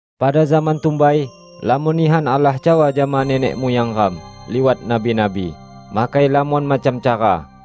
Pada zaman tumbai lamon nihan Allah cawa jama nenek muyang ram liwat nabi-nabi, makai lamon macam cara.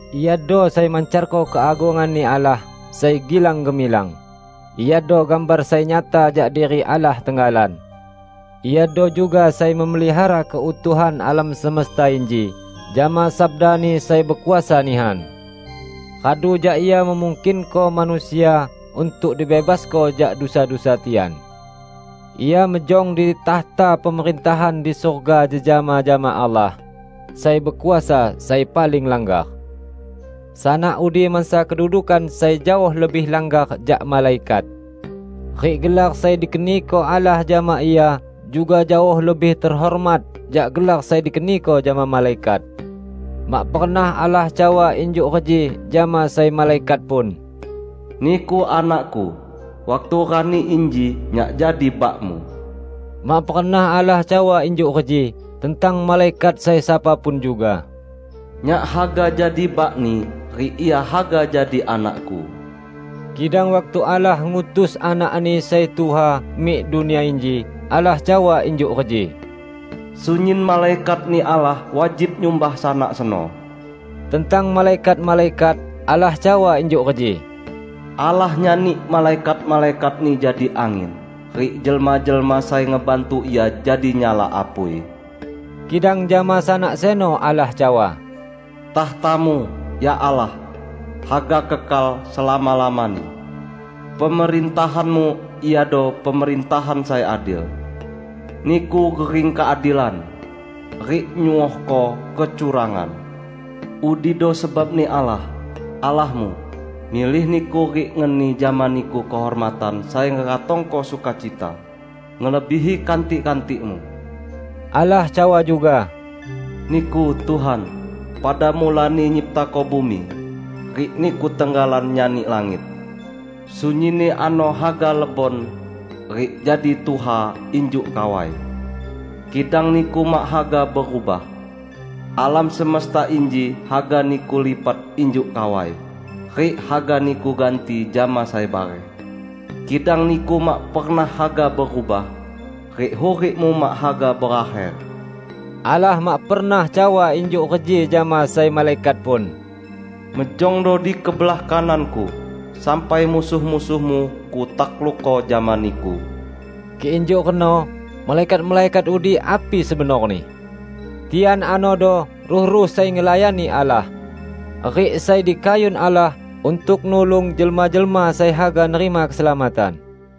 Iado sai mancarko keagungan-Ni Allah sai gilang-gemilang; Iado gambar sai nyata jak diri Allah tenggalan. Iado juga sai memelihara keutuhan alam semesta inji jama sabda-Ni sai bekuasa nihan. Radu jak Ia memungkinko manusia untuk dibebasko jak dusa-dusa tian, Ia mejong di takhta pemerintahan di surga jejama jama Allah, Sai Bekuasa sai paling langgar. Sanak udi mansa kedudukan sai jaoh lebih langgar jak malaikat, rik gelar sai dikeniko Allah jama Ia juga jaoh lebih tehormat jak gelar sai dikeniko jama malaikat. Mak pernah Allah cawa injuk reji jama sai malaikat pun, "Niku Anak-Ku; waktu rani inji Nyak jadi Bak-Mu." Mak pernah Allah cawa injuk reji tentang malaikat sai sapa pun juga, "Nyak haga jadi Bak-Ni, rik Ia haga jadi Anak-Ku." Kidang waktu Allah ngutus Anak-Ni sai tuha mik dunia inji, Allah cawa injuk reji, "Sunyin malaikat-Ni Allah wajib nyumbah Sanak seno." Tentang malaikat-malaikat, Allah cawa injuk reji, "Allah nyani malaikat-malaikat-Ni jadi angin, rik jelma-jelma sai ngebantu Ia jadi nyala apui." Kidang jama Sanak seno, Allah cawa, "Takhta-Mu, ya Allah, haga kekal selama-lamani! Pemerintahan-Mu iado pemerintahan sai adil. Niku gering keadilan, rik nyuohko kecurangan; udido sebab-Ni Allah, Allah-Mu, milih Niku rik ngeni jama Niku kehormatan sai ngeratongko sukacita, ngelebihi kantik-kantik-Mu." Allah cawa juga, "Niku, Tuhan, pada mulani nyiptako bumi, rik Niku tenggalan nyani langit. Sunyinni ano haga lebon, rik jadi tuha injuk kawai; kidang Niku mak haga berubah. Alam semesta inji haga Niku lipat injuk kawai, rik haga Niku ganti jama sai bareh. Kidang Niku mak pernah haga berubah, rik hurik-Mu mak haga berakher." Allah mak pernah cawa injuk reji jama sai malaikat pun, "Mejongdo di kebelah kanan-Ku, sampai musuh-musuhmu Kutaklukko jama Niku." Kik injuk reno, malaikat-malaikat udi api sebenorni? Tian anodo ruh-ruh sai ngelayani Allah, rik sai dikayun Allah untuk nulung jelma-jelma sai haga nerima keselamatan.